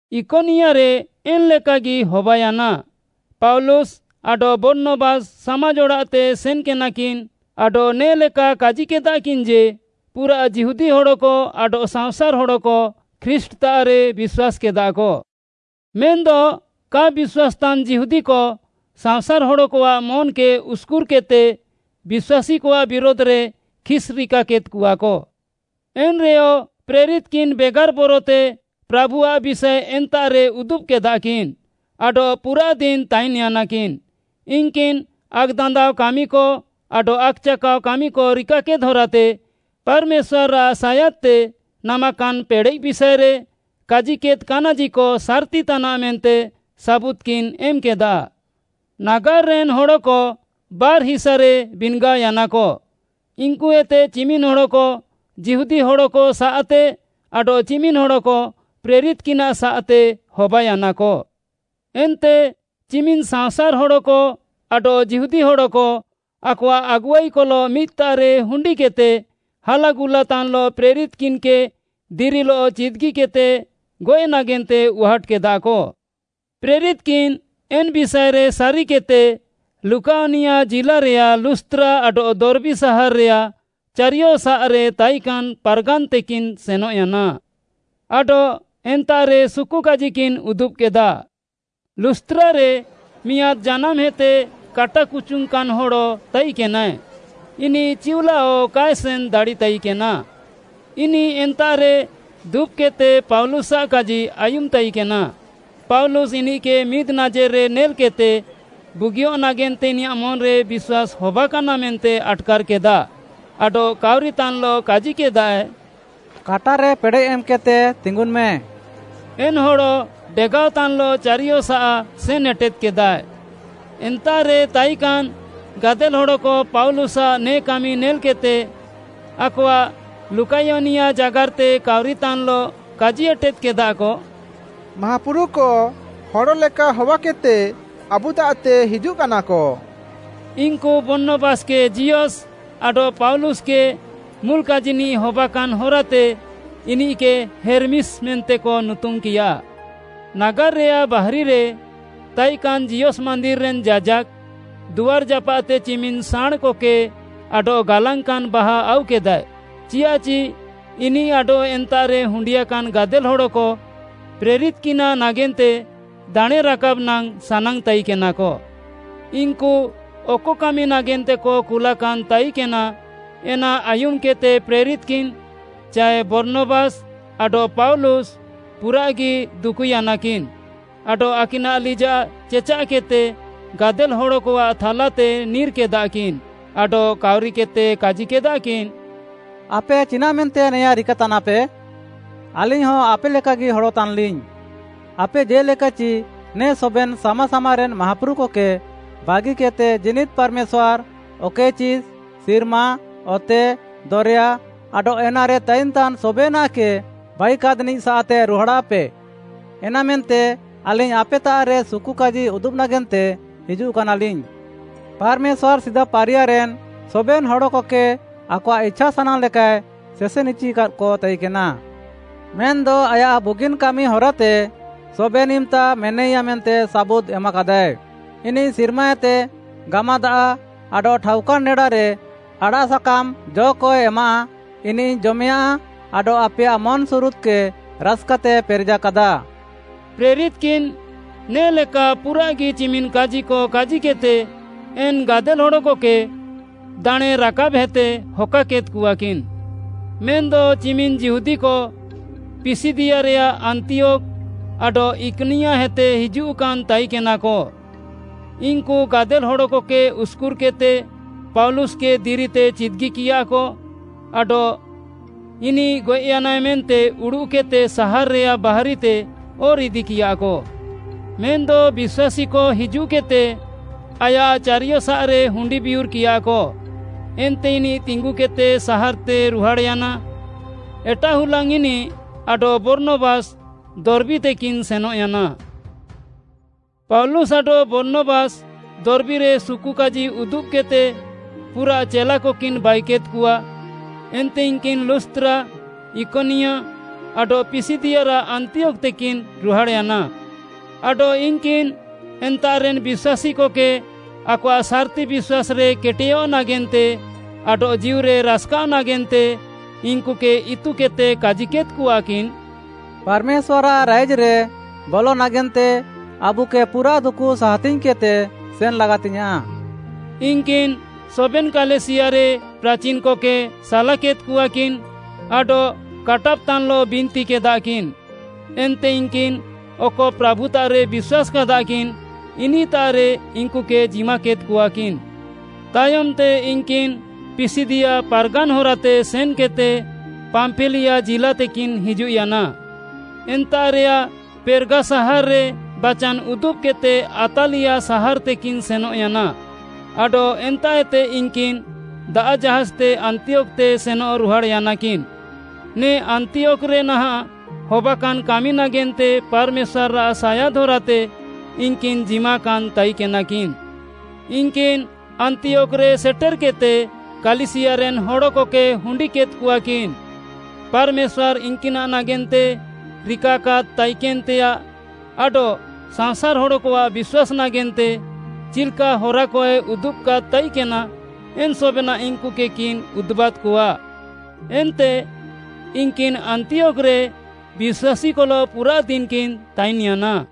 ଇକନିୟାରେ ଏନ୍‌ଲେକାଗି ହବାୟାନା, ପାଉଲୁସ୍‌ ଆଡଃ ବର୍ଣ୍ଣବାସ୍‌ ସାମାଜ୍‌ ଅଡ଼ାଃତେ ସେନ୍‌କେନାକିନ୍‌ ଆଡଃ ନେ'ଲେକା କାଜିକେଦାକିନ୍‌ ଯେ, ପୁରାଃ ଯିହୁଦୀ ହଡ଼କ ଆଡଃ ସାଅଁସାର୍‌ ହଡ଼କ ଖ୍ରୀଷ୍ଟ୍‌ତାଃରେ ବିଶ୍ୱାସ୍‌କେଦାକ। ମେନ୍‌ଦ କା ବିଶ୍ୱାସ୍‌ତାନ୍‌ ଯିହୁଦୀକ ସାଅଁସାର୍‌ ହଡ଼କଆଃ ମନ୍‌କେ ଉସ୍‌କୁର୍‌କେଦ୍‌ତେ ବିଶ୍ୱାସୀକଆଃ ବିରୁଧ୍‌ରେ ଖିସ୍‌ରିକାକେଦ୍‌କଆକ। ଏନ୍‌ରେୟ ପ୍ରେରିତ୍‌କିନ୍‌ ବେଗାର୍‌ ବରତେ ପ୍ରାଭୁଆଃ ବିଷାଏ ଏନ୍ତାଃରେ ଉଦୁବ୍‌କେଦାକିନ୍‌ ଆଡଃ ପୁରାଃ ଦିନ୍‌ ତାଇନ୍‌ୟାନାକିନ୍‌। ଇନ୍‌କିନ୍‌ ଆକ୍‌ଦାନ୍ଦାଅ କାମିକ ଆଡଃ ଆକ୍‌ଚାକାଅ କାମିକ ରିକାକେଦ୍‌ ହରାତେ ପାର୍‌ମେଶ୍ୱାର୍‌ଆଃ ସାୟାଦ୍‌ତେ ନାମାକାନ୍‌ ପେଡ଼େଃ ବିଷାଏରେ କାଜିକେଦ୍‌ କାନାଜିକ ସାର୍‌ତି ତାନାଃ ମେନ୍ତେ ସାବୁଦ୍‌କିନ୍‌ ଏମ୍‌କେଦା। ନାଗାର୍‌ରେନ୍‌ ହଡ଼କ ବାର୍‌ହିସାରେ ବିନ୍‌ଗାଅୟାନାକ, ଇନ୍‌କୁଏତେ ଚିମିନ୍‌ ହଡ଼କ ଯିହୁଦୀ ହଡ଼କସାଃତେ ଆଡଃ ଚିମିନ୍‌ ହଡ଼କ ପ୍ରେରିତ୍‌କିନାଃ ସାଃତେ ହବାୟାନାକ। ଏନ୍ତେ ଚିମିନ୍‌ ସାଅଁସାର୍‌ ହଡ଼କ ଆଡଃ ଯିହୁଦୀ ହଡ଼କ ଆକଆଃ ଆଗୁଆଇକଲଃ ମିଦ୍‌ତାଃରେ ହୁଣ୍ଡିକେଦ୍‌ତେ ହାଲାଗୁଲାତାନ୍‌ଲଃ ପ୍ରେରିତ୍‌କିନ୍‌କେ ଦିରିଲଃ ଚିଦ୍‌ଗିକେଦ୍‌ତେ ଗଏଃ ନାଗେନ୍ତେ ଉହାଟ୍‌କେଦାକ। ପ୍ରେରିତ୍‌କିନ୍‌ ଏନ୍‌ ବିଷାଏରେ ସାରିକେଦ୍‌ତେ ଲୁକାୟନିଆ ଜିଲ୍ଲାରେୟାଃ ଲୁସ୍‌ତ୍ରା ଆଡଃ ଦର୍ବୀ ସାହାର୍‌ରେୟାଃ ଚାରିୟସାଃରେ ତାଇକାନ୍‌ ପାର୍‌ଗାନ୍‌ତେକିନ୍‌ ସେନଃୟାନା। ଆଡଃ ଏନ୍ତାଃରେ ସୁକୁକାଜିକିନ୍‌ ଉଦୁବ୍‌କେଦା। ଲୁସ୍‌ତ୍ରାରେ ମିଆଁଦ୍‌ ଜାନାମ୍‌ହେତେ କାଟା କୁଚୁଙ୍ଗ୍‌କାନ୍‌ ହଡ଼ ତାଇକେନାଏ। ଇନିଃ ଚିଉଲାଅ କାଏ ସେନ୍‌ ଦାଡ଼ିତାଇକେନା। ଇନିଃ ଏନ୍ତାଃରେ ଦୁବ୍‌କେଦ୍‌ତେ ପାଉଲୁସ୍‌ଆଃ କାଜି ଆୟୁମ୍‌ ତାଇକେନା। ପାଉଲୁସ୍‌ ଇନିଃକେ ମିଦ୍‌ ନାଜେର୍‌ରେ ନେଲ୍‌କେଦ୍‌ତେ, ବୁଗିୟଃ ନାଗେନ୍ତେ ଇନିୟାଃ ମନ୍‌ରେ ବିଶ୍ୱାସ୍‌ ହବାକାନା ମେନ୍ତେ ଆଟ୍‌କାର୍‌କେଦା, ଆଡଃ କାଉରିତାନ୍‌ଲଃ କାଜିକେଦାଏ, “କାଟାରେ ପେଡ଼େଃ ଏମ୍‌କେଦ୍‌ତେ ତିଙ୍ଗୁନ୍‌ମେ!” ଏନ୍‌ ହଡ଼ ଡେଗାଅତାନ୍‌ଲଃ ଚାରିୟସାଃ ସେନ୍‌ ଏଟେଦ୍‌କେଦାଏ। ଏନ୍ତାଃରେ ତାଇକାନ୍‌ ଗାଦେଲ୍‌ ହଡ଼କ ପାଉଲୁସ୍‌ଆଃ ନେ କାମି ନେଲ୍‌କେଦ୍‌ତେ, ଆକଆଃ ଲୁକାୟନିଆ ଜାଗାର୍‌ତେ କାଉରିତାନ୍‌ଲଃ କାଜି ଏଟେଦ୍‌କେଦାକ, “ମାହାପୁରୁକ ହଡ଼ ଲେକା ହବାକେଦ୍‌ତେ ଆବୁତାଃତେ ହିଜୁଃକାନାକ।” ଇନ୍‌କୁ ବର୍ଣ୍ଣବାସ୍‌କେ ଜିଅସ୍‌ ଆଡଃ ପାଉଲୁସ୍‌ ମୁଲ୍‌ କାଜିନିଃ ହବାକାନ୍‌ ହରାତେ ଇନିଃକେ ହେର୍‌ମିସ୍‌ ମେନ୍ତେକ ନୁତୁମ୍‌କିୟା। ନାଗାର୍‌ରେୟାଃ ବାହାରିରେ ତାଇକାନ୍‌ ଜିଅସ୍‌ ମାନ୍ଦିର୍‌ରେନ୍‌ ଯାଜାକ୍‌, ଦୁଆର୍‌ ଜାପାଃତେ ଚିମିନ୍‌ ସାଁଣ୍‌କକେ ଆଡଃ ଗାଲାଙ୍ଗ୍‌କାନ୍‌ ବାହା ଆଉକେଦାଏ, ଚିଆଃଚି ଇନିଃ ଆଡଃ ଏନ୍ତାଃରେ ହୁଣ୍ଡିୟାକାନ୍‌ ଗାଦେଲ୍‌ ହଡ଼କ ପ୍ରେରିତ୍‌କିନାଃ ନାଗେନ୍ତେ ଦାଣେଁ ରାକାବ୍‌ ନାଙ୍ଗ୍‌ ସାନାଙ୍ଗ୍‌ ତାଇକେନାକ। ଇନ୍‌କୁ ଅକ କାମି ନାଗେନ୍ତେକ କୁଲାକାନ୍‌ ତାଇକେନା, ଏନା ଆୟୁମ୍‌କେଦ୍‌ତେ ପ୍ରେରିତ୍‌କିନ୍‌ ଚାଏ ବର୍ଣ୍ଣବାସ୍‌ ଆଡଃ ପାଉଲୁସ୍‌ ପୁରାଃଗି ଦୁକୁୟାନାକିନ୍‌ ଆଡଃ ଆକିନାଃ ଲିଜାଃ ଚେଚାଃକେଦ୍‌ତେ ଗାଦେଲ୍‌ ହଡ଼କଆଃ ଥାଲାତେ ନିର୍‌କେଦାକିନ୍‌ ଆଡଃ କାଉରିକେଦ୍‌ତେ କାଜିକେଦାକିନ୍‌, “ଆପେ ଚିନାଃମେନ୍ତେ ନେଆଁ ରିକାତାନାପେ? ଆଲିଙ୍ଗ୍‌ହ ଆପେ ଲେକାଗି ହଡ଼ ତାନ୍‌ଲିଙ୍ଗ୍‌। ଆପେ ଜେ'ଲେକାଚି ନେ ସବେନ୍‌ ସାମା ସାମାରେନ୍‌ ମାହାପୁରୁକକେ ବାଗିକେଦ୍‌ତେ ଜୀନିଦ୍‌ ପାର୍‌ମେଶ୍ୱାର୍‌, ଅକଏଚି ସିର୍ମା, ଅତେ, ଦରେୟା ଆଡଃ ଏନାରେ ତାଇନ୍‌ତାନ୍‌ ସବେନାଃକେ ବାଇୟାକାଦ୍‌ନିଃ ସାଃତେ ରୁହାଡ଼ାଃପେ। ଏନାମେନ୍ତେ ଆଲିଙ୍ଗ୍‌ ଆପେତାଃରେ ସୁକୁକାଜି ଉଦୁବ୍‌ ନାଗେନ୍ତେ ହିଜୁଃକାନାଲିଙ୍ଗ୍‌। ପାର୍‌ମେଶ୍ୱାର୍‌ ସିଦା ପାରିୟାରେନ୍‌ ସବେନ୍‌ ହଡ଼କକେ ଆକଆଃ ଇଛାସାନାଙ୍ଗ୍‌ ଲେକାଏ ସେସେନ୍‌ଇଚିକାକ ତାଇକେନା। ମେନ୍‌ଦ ଆୟାଃ ବୁଗିନ୍‌ କାମି ହରାତେ ସବେନ୍‌ ଇମ୍‌ତା ମେନାଇୟା ମେନ୍ତେ ସାବୁଦ୍‌ ଏମାକାଦାଏ। ଇନିଃ ସିର୍ମାଏତେ ଗାମାଦାଆଃ ଆଡଃ ଠାଉକାନ୍‌ ନେଡାରେ ଆଡ଼ାଃ ସାକାମ୍‌ ଜ'କଏ ଏମାଃ, ଇନିଃ, ଜମେୟାଁ ଆଡଃ ଆପେୟାଃ ମନ୍‌ସୁରୁଦ୍‌କେ ରାସ୍‌କାତେ ପେରେଜାକାଦା।” ପ୍ରେରିତ୍‌କିନ୍‌ ନେ'ଲେକା ପୁରାଃଗି ଚିମିନ୍‌ କାଜିକ କାଜିକେଦ୍‌ତେ ଏନ୍‌ ଗାଦେଲ୍‌ ହଡ଼କକେ ଦାଣେଁ ରାକାବ୍‌ହେତେ ହକାକେଦ୍‌କଆକିନ୍‌। ମେନ୍‌ଦ ଚିମିନ୍‌ ଯିହୁଦୀକ ପିସିଦିଆରେୟାଃ ଆନ୍ତିୟୋଖ୍‌ ଆଡଃ ଇକନିୟାହେତେ ହିଜୁଃକାନ୍‌ ତାଇକେନାକ, ଇନ୍‌କୁ ଗାଦେଲ୍‌ ହଡ଼କକେ ଉସ୍‍କୁର୍‍କେଦ୍‌ତେ ପାଉଲୁସ୍‌କେ ଦିରିତେ ଚିଦ୍‌ଗିକିୟାକ ଆଡଃ ଇନିଃ ଗଏଃୟାନାଏ ମେନ୍ତେ ଉଡ଼ୁଃକେଦ୍‌ତେ ସାହାର୍‌ରେୟାଃ ବାହାରିତେ ଅର୍‌ ଇଦିକିୟାକ। ମେନ୍‌ଦ ବିଶ୍ୱାସୀକ ହିଜୁଃକେଦ୍‌ତେ ଆୟାଃ ଚାରିୟସାଃରେ ହୁଣ୍ଡି ବିୟୁର୍‌କିୟାକ ଏନ୍ତେ ଇନିଃ ତିଙ୍ଗୁକେଦ୍‌ତେ ସାହାର୍‌ତେ ରୁହାଡ଼୍‌ୟାନା। ଏଟାଃ ହୁଲାଙ୍ଗ୍‌ ଇନିଃ ଆଡଃ ବର୍ଣ୍ଣବାସ୍‌ ଦର୍ବୀତେକିନ୍‌ ସେନଃୟାନା। ପାଉଲୁସ୍‌ ଆଡଃ ବର୍ଣ୍ଣବାସ୍‌ ଦର୍ବୀରେ ସୁକୁକାଜି ଉଦୁବ୍‌କେଦ୍‌ତେ ପୁରାଃ ଚେଲାକକିନ୍‌ ବାଇକେଦ୍‌କଆ। ଏନ୍ତେ ଇନ୍‌କିନ୍‌ ଲୁସ୍‌ତ୍ରା, ଇକନିୟା ଆଡଃ ପିସିଦିଆରାଃ ଆନ୍ତିୟୋଖ୍‌ତେକିନ୍‌ ରୁହାଡ଼୍‌ୟାନା। ଆଡଃ ଇନ୍‌କିନ୍‌ ଏନ୍ତାଃରେନ୍‌ ବିଶ୍ୱାସୀକକେ ଆକଆଃ ସାର୍‌ତି ବିଶ୍ୱାସ୍‌ରେ କେଟେୟଃ ନାଗେନ୍ତେ ଆଡଃ ଜୀଉରେ ରାସ୍‌କାଅଃ ନାଗେନ୍ତେ ଇନ୍‌କୁକେ ଇତୁକେଦ୍‌ତେ କାଜିକେଦ୍‌କଆକିନ୍‌, “ପାର୍‌ମେଶ୍ୱାର୍‌ଆଃ ରାଇଜ୍‌ରେ ବଲ ନାଗେନ୍ତେ ଆବୁକେ ପୁରାଃ ଦୁକୁ ସାହାତିଙ୍ଗ୍‌କେଦ୍‌ତେ ସେନ୍‌ ଲାଗାତିଙ୍ଗ୍‌ୟାଁଃ।” ଇନ୍‌କିନ୍‌ ସବେନ୍‌ କାଲିସିୟାରେ ପ୍ରାଚିନ୍‌କକେ ସାଲାକେଦ୍‌କଆକିନ୍‌ ଆଡଃ କାଟାବ୍‌ତାନ୍‌ଲଃ ବିନ୍ତିକେଦାକିନ୍‌, ଏନ୍ତେ ଇନ୍‌କିନ୍‌ ଅକ ପ୍ରାଭୁତାଃରେ ବିଶ୍ୱାସ୍‌କାଦାକିନ୍‌, ଇନିଃତାଃରେ ଇନ୍‌କୁକେ ଜିମାକେଦ୍‌କଆକିନ୍‌। ତାୟମ୍‌ତେ ଇନ୍‌କିନ୍‌ ପିସିଦିଆ ପାର୍‌ଗାନ୍‌ ହରାତେ ସେନ୍‌କେଦ୍‌ତେ ପାମ୍ପିଲିଆ ଜିଲ୍ଲାତେକିନ୍‌ ହିଜୁଃୟାନା। ଏନ୍ତାଃରେୟାଃ ପେର୍‌ଗା ସାହାର୍‌ରେ ବାଚାନ୍‌ ଉଦୁବ୍‌କେଦ୍‌ତେ ଆତ୍ତାଲିଆ ସାହାର୍‌ତେକିନ୍‌ ସେନଃୟାନା, ଆଡଃ ଏନ୍ତାଃଏତେ ଇନ୍‌କିନ୍‌ ଦାଆଃ ଜାହାଜ୍‌ତେ ଆନ୍ତିୟୋଖ୍‌ତେ ସେନଃ ରୁହାଡ଼୍‌ୟାନାକିନ୍‌, ନେ ଆନ୍ତିୟୋଖ୍‌ରେ ନାହାଁଃ ହବାକାନ୍‌ କାମି ନାଗେନ୍ତେ ପାର୍‌ମେଶ୍ୱାର୍‌ଆଃ ସାୟାଦ୍‌ ହରାତେ ଇନ୍‌କିନ୍‌ ଜିମାକାନ୍‌ ତାଇକେନାକିନ୍‌। ଇନ୍‌କିନ୍‌ ଆନ୍ତିୟୋଖ୍‌ରେ ସେଟେର୍‌କେଦ୍‌ତେ କାଲିସିୟାରେନ୍‌ ହଡ଼କକେ ହୁଣ୍ଡିକେଦ୍‌କଆକିନ୍‌। ପାର୍‌ମେଶ୍ୱାର୍‌ ଇନ୍‌କିନାଃ ନାଗେନ୍ତେ ରିକାକାଦ୍‌ ତାଇକେନ୍‌ତେୟାଃ ଆଡଃ ସାଅଁସାର୍‌ ହଡ଼କଆଃ ବିଶ୍ୱାସ୍‌ ନାଗେନ୍ତେ ଚିଲ୍‌କା ହରାକଏ ଉଦୁବ୍‌କାଦ୍‌ ତାଇକେନା, ଏନ୍‌ ସବେନାଃ ଇନ୍‌କୁକେକିନ୍‌ ଉଦୁବାଦ୍‌କଆ। ଏନ୍ତେ ଇନ୍‌କିନ୍‌ ଆନ୍ତିୟୋଖ୍‌ରେ ବିଶ୍ୱାସୀକଲଃ ପୁରାଃ ଦିନ୍‌କିନ୍‌ ତାଇନ୍‌ୟାନା।